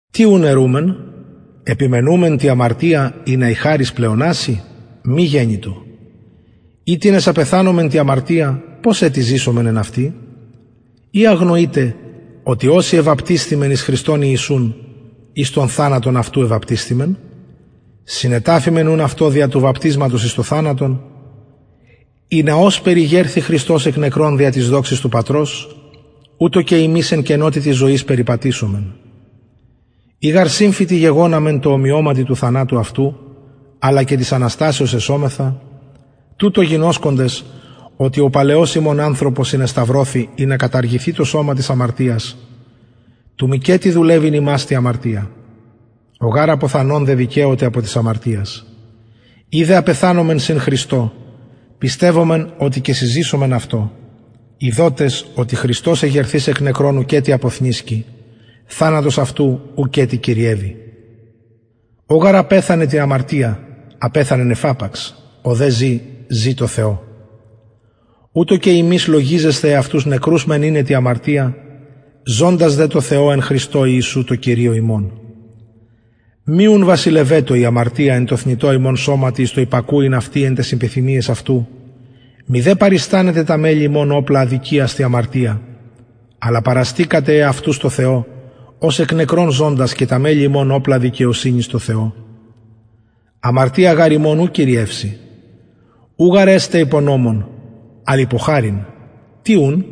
τι ουν ερουμεν επιμενομεν τη αμαρτια ινα η χαρις πλεοναση μη γενοιτο οιτινες απεθανομεν τη αμαρτια πως ετι ζησομεν εν αυτη η αγνοειτε οτι οσοι εβαπτισθημεν εις χριστον ιησουν εις τον θανατον αυτου εβαπτισθημεν συνεταφημεν ουν αυτω δια του βαπτισματος εις τον θανατον ινα ωσπερ ηγερθη χριστος εκ νεκρων δια της δοξης του πατρος ουτως και ημεις εν καινοτητι ζωης περιπατησωμεν ει γαρ συμφυτοι γεγοναμεν τω ομοιωματι του θανατου αυτου αλλα και της αναστασεως εσομεθα τουτο γινωσκοντες οτι ο παλαιος ημων ανθρωπος συνεσταυρωθη ινα καταργηθη το σωμα της αμαρτιας του μηκετι δουλευειν ημας τη αμαρτια ο γαρ αποθανων δεδικαιωται απο της αμαρτιας ει δε απεθανομεν συν χριστω πιστευομεν οτι και συζησομεν αυτω ειδοτες οτι χριστος εγερθεις εκ νεκρων ουκετι αποθνησκει θανατος αυτου ουκετι κυριευει ο γαρ απεθανεν τη αμαρτια απεθανεν εφαπαξ ο δε ζη ζη τω θεω ουτως και υμεις λογιζεσθε εαυτους νεκρους μεν ειναι τη αμαρτια ζωντας δε τω θεω εν χριστω ιησου τω κυριω ημων μη ουν βασιλευετω η αμαρτια εν τω θνητω υμων σωματι εις το υπακουειν αυτη εν ταις επιθυμιαις αυτου μηδε παριστανετε τα μελη υμων οπλα αδικιας τη αμαρτια αλλα παραστησατε εαυτους τω θεω ως εκ νεκρων ζωντας και τα μελη υμων οπλα δικαιοσυνης τω θεω αμαρτια γαρ υμων ου κυριευσει ου γαρ εστε υπο νομον αλλ υπο χαριν τι ουν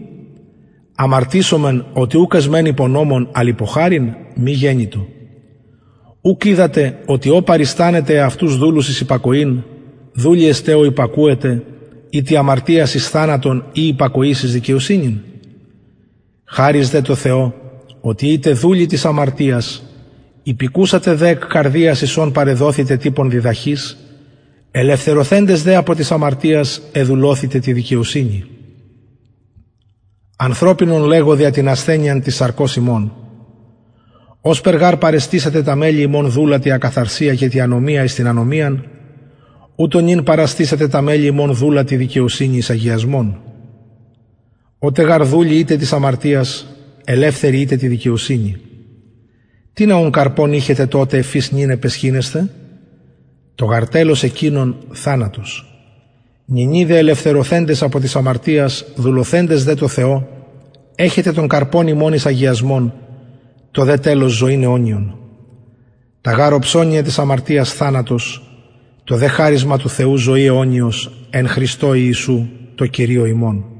αμαρτησομεν οτι ουκ εσμεν υπο νομον αλλ υπο χαριν μη γενοιτο ουκ οιδατε οτι ω παριστανετε εαυτους δουλους εις υπακοην δουλοι εστε ω υπακουετε ητοι αμαρτιας εις θανατον η υπακοης εις δικαιοσυνην χαρις δε τω θεω οτι ητε δουλοι της αμαρτιας υπηκουσατε δε εκ καρδιας εις ον παρεδοθητε τυπον διδαχης ελευθερωθεντες δε απο της αμαρτιας εδουλωθητε τη δικαιοσυνη ανθρωπινον λεγω δια την ασθενειαν της σαρκος υμων ωσπερ γαρ παρεστησατε τα μελη υμων δουλα τη ακαθαρσια και τη ανομια εις την ανομιαν ουτως νυν παραστησατε τα μελη υμων δουλα τη δικαιοσυνη εις αγιασμον οτε γαρ δουλοι ητε της αμαρτιας ελευθεροι ητε τη δικαιοσυνη τινα ουν καρπον ειχετε τοτε εφ οις νυν επαισχυνεσθε το γαρ τελος εκεινων θανατος νυνι δε ελευθερωθεντες απο της αμαρτιας δουλωθεντες δε τω θεω εχετε τον καρπον υμων εις αγιασμον το δε τελος ζωην αιωνιον τα γαρ οψωνια της αμαρτιας θανατος το δε χαρισμα του θεου ζωη αιωνιος εν χριστω ιησου τω κυριω ημων